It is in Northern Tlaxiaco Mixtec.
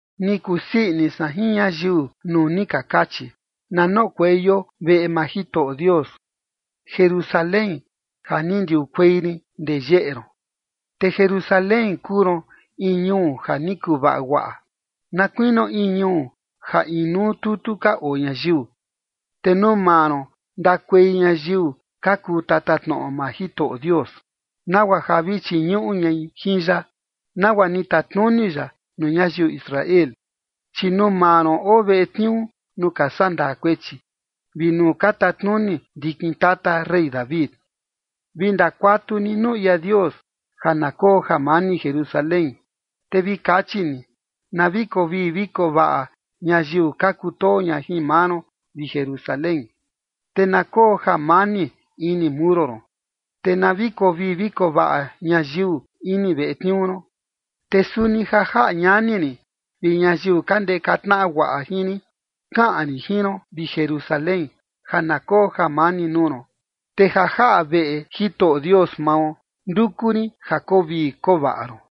Ni kusii ini san jin ñayiu nuu ni ka kachi: “Na noꞌokueio veꞌe maa Jitoꞌo Dios”. Jerusalén, ja ni ndiukuei rin ndee yeꞌe ron. Te Jerusalén, kuu ron in ñuu ja ni kuvaꞌa guaꞌa, na kuinio in ñuu ja inuu tutu ka oo ñayiu. Te nuu maa ron ndakuei ñayiu ka kuu tatatnoꞌo maa Jitoꞌo Dios, nagua ja vi chiñuꞌu ñai jin ya, nagua ni tatnuni ya nuu ñayiu Israel. Chi nuu maa ron oo veꞌe tniuu nuu ka sandaa kuechi, vi nuu ka tatnuni ndikin tata rey David. Vi ndakuatu ni nuu ia Dios ja na koo jamani Jerusalén, te vi kachi ni: “Na vi koo vii vi koo vaꞌa ñayiu ka kutoo ña jin maa ron, vi Jerusalén. Te na koo jamani ini muro ron, te na vi koo vii vi koo vaꞌa ñayiu ini veꞌe tniuu ron.” Te suni ja jaꞌa ñani rin vi ñayiu ka ndeka tnaꞌa guaꞌa jin rin, kaꞌan rin jin ron, vi Jerusalén: “Ja na koo jamani nuu ron”. Te ja jaꞌa veꞌe Jitoꞌo Dios mao, nduku rin ja koo vii koo vaꞌa ron.